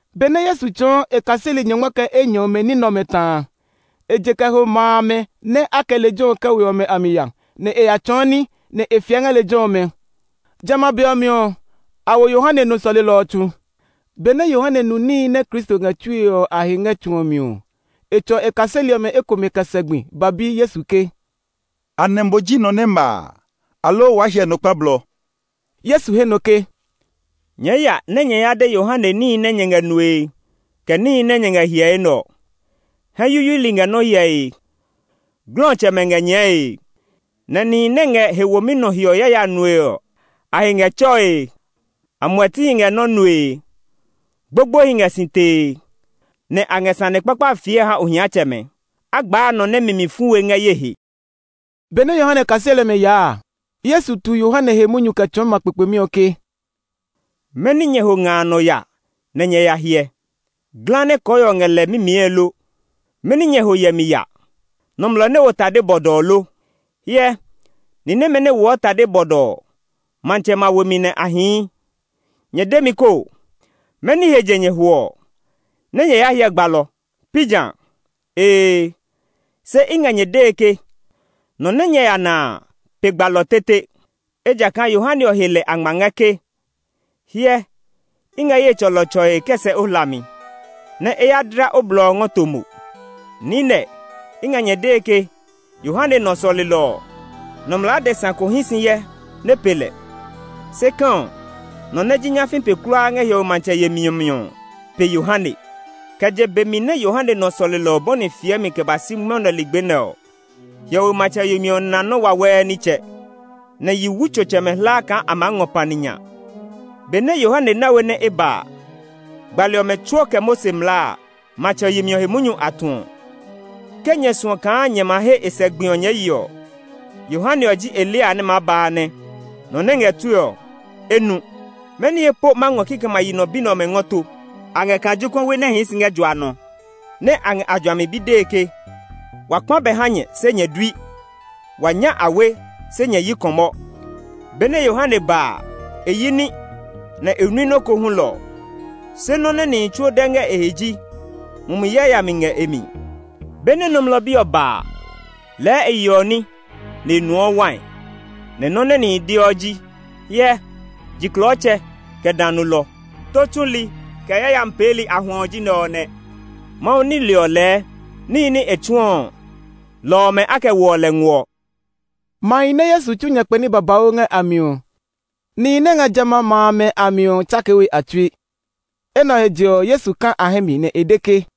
Benɛ Yesu tsɔɔ e kaseli nyɔngma kɛ enyɔ ɔmɛ ní nɛ ɔmɛ ta a, e je kɛ ho ma amɛ nɛ a kɛ lejɛ ɔ kɛ we ɔ a mi ya, nɛ e ya tsɔɔ ní, nɛ e fiɛ ngɛ lejɛ ɔmɛ. Jamɛ a be ɔ mi ɔ, a wo Yohane nɔ sɔlelɔ ɔ tsu. Benɛ Yohane nu níhi nɛ Kristo ngɛ tsue ɔ a he ngɛ tsu ɔ mi ɔ, e tsɔ e kaseli ɔmɛ ekomɛ kɛ sɛ gbi nɛ ɔ ba ha Yesu ke, “Anɛ mo ji nɔ nɛ ma a, aloo waa hyɛ nɔ kpa blɔ?” Yesu he nɔ ke, “Nyɛɛ ya nɛ nyɛ ya de Yohane níhi nɛ nyɛ ngɛ nue, kɛ níhi nɛ nyɛ ngɛ hyɛe nɛ ɔ. Hɛ yuyuili ngɛ nɔ́ hyɛe, glɔtsɛmɛ ngɛ nyɛɛe, nɛ nihi nɛ ngɛ he womi nɔ hiɔ yaya nue ɔ, a he ngɛ tsɔe; amuɛtihi ngɛ nɔ́ nue, gbogboehi ngɛ si tee, nɛ a ngɛ sane kpakpa fiɛe ha ohiatsɛmɛ. A gbaa nɔ nɛ mi mi fu we ngɛ ye he.” Benɛ Yohane kaseli ɔmɛ yaa a, Yesu tu Yohane he munyu kɛ tsɔɔ ma kpekpemi ɔ ke, “Mɛni nyɛ ho nga a nɔ ya nɛ nyɛ yaa hyɛ? Ngɔwu nɛ kɔɔhiɔ ngɛ lɛ mimiɛe lo? Mɛni nyɛ ho hyɛmi ya? Nɔmlɔ nɛ wo tade bɔdɔɔ lo? Hyɛ, ni nɛmɛ nɛ woɔ tade bɔdɔɔ ɔ, matsɛmɛ a we mi nɛ a hii. Nyɛ de mi koo! Mɛni he je nyɛ ho ɔ? Nɛ́ nyɛ ya hyɛ gbalɔ, pi ja? Ee! Se i ngɛ nyɛ dee ke nɔ nɛ nyɛ ya na a pe gbalɔ tete. Ejakaa Yohane ɔ he lɛ a ngma ngɛ ke, ‘Hyɛ, i ngɛ ye tsɔlɔ ɔ tsɔe kɛ sɛ o hlami, nɛ e ya dla o blɔ ɔ ngɔ to mo.’ Niinɛ, i ngɛ nyɛ dee ke Yohane nɔ sɔlelɔ ɔ, nɔmlɔ adesa ko hí si hyɛ nɛ pe lɛ. Se kɛ̃ ɔ, nɔ nɛ ji nyafii pe kulaa ngɛ hiɔwe matsɛ yemi ɔ mi ɔ pe Yohane. Kɛ je be mi nɛ Yohane nɔ sɔlelɔ ɔ bɔni fiɛmi kɛ ba si mwɔnɛ ligbi nɛ ɔ, hiɔwe matsɛ yemi ɔ na nɔ́ wawɛɛ nitsɛ; nɛ yiwutsotsɛmɛ hlaa kaa a maa ngɔ pani nya. Be nɛ Yohane na we nɛ e ba a, gbali ɔmɛ tsuo kɛ Mose mlaa a, matsɛ yemi ɔ he munyu a tuɔ. Ke nyɛ suɔ kaa nyɛ ma he a sɛ gbi ɔ nyɛɛ ye ɔ, Yohane ɔ ji Eliya nɛ maa ba a nɛ. Nɔ nɛ ngɛ tue ɔ, e nu! “Mɛni he po ma ngɔ kikɛmɛ a yi nɔ bi nɛ ɔmɛ ngɔ to? A ngɛ kaa jokuɛwi nɛ hii si ngɛ jua nɔ, nɛ a ngɛ a juami bi dee ke, ‘Wa kpã bɛ ha nyɛ, se nyɛ dui; wa nya awe, se nyɛ yi kɔmɔ.’ Benɛ Yohane ba a, e yi ní, nɛ e nui nɔ́ ko hulɔ. Se nɔ́ nɛ nihi tsuo de ngɛ e he ji, ‘Mumi yayami ngɛ e mi!’ Benɛ Nɔmlɔ Bi ɔ ba a, lɛɛ e yeɔ ní, nɛ e nuɔ wai. Nɛ nɔ́ nɛ nihi deɔ ji, ‘Hyɛ, jiklɔɔtsɛ, kɛ dã nulɔ; tó tsuli, kɛ yayami peeli a huɛ ɔ ji nɛ ɔ nɛ!’ Mawu nile ɔ lɛɛ níhi nɛ e tsuɔ ɔ, lɔ ɔmɛ a kɛ woɔ lɛ nguɔ.” Mahi nɛ Yesu tsu nyakpɛ ní babauu ngɛ a mi ɔ, nihi nɛ ngɛ jamɛ a ma amɛ a mi ɔ tsakee we a tsui. Enɛ ɔ he je ɔ, Yesu ka a hɛ mi, nɛ e de ke,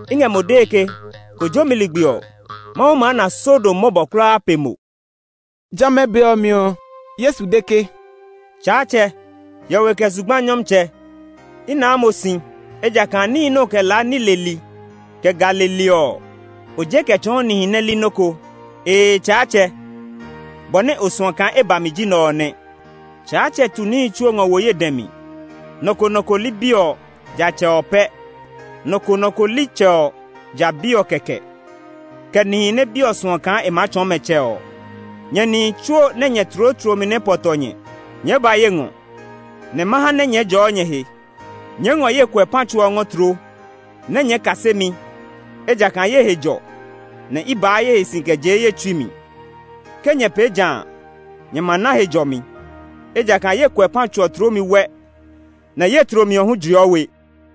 I ngɛ mo dee ke kojomi ligbi ɔ, Mawu maa na Sodom mɔbɔ kulaa pe mo.” Jamɛ a be ɔ mi ɔ, Yesu de ke, “Tsaatsɛ, hiɔwe kɛ zugba Nyɔmtsɛ! I naa mo si, ejakaa níhi nɛ o ngɔ kɛ laa ní leli, kɛ ga leli ɔ, o je kɛ tsɔɔ nihi nɛ li nɔ́ ko. Ee, Tsaatsɛ, bɔ nɛ o suɔ kaa e ba mi ji nɛ ɔ nɛ. “Tsaatsɛ tu níhi tsuo ngɔ wo ye dɛ mi. Nɔ ko nɔ ko li Bi ɔ, ja Tsɛ ɔ pɛ; nɔ ko nɔ ko li Tsɛ ɔ, ja Bi ɔ kɛkɛ, kɛ nihi nɛ Bi ɔ suɔ kaa e maa tsɔɔ mɛ Tsɛ ɔ. “Nyɛ nihi tsuo nɛ nyɛ tloo tlomi nɛ pɔ tɔ nyɛ, nyɛɛ ba ye ngɔ, nɛ ma ha nɛ nyɛɛ jɔɔ nyɛ he. Nyɛɛ ngɔ ye kuɛpã tso ɔ ngɔɔ tloo, nɛ nyɛɛ kase mi; ejakaa ye he jɔ, nɛ i baa ye he si kɛ jee ye tsui mi. Ke nyɛ pee ja a, nyɛ ma na he jɔmi; ejakaa ye kuɛpã tso ɔ tloomi wɛ, nɛ ye tlomi ɔ hu jiɔ we.”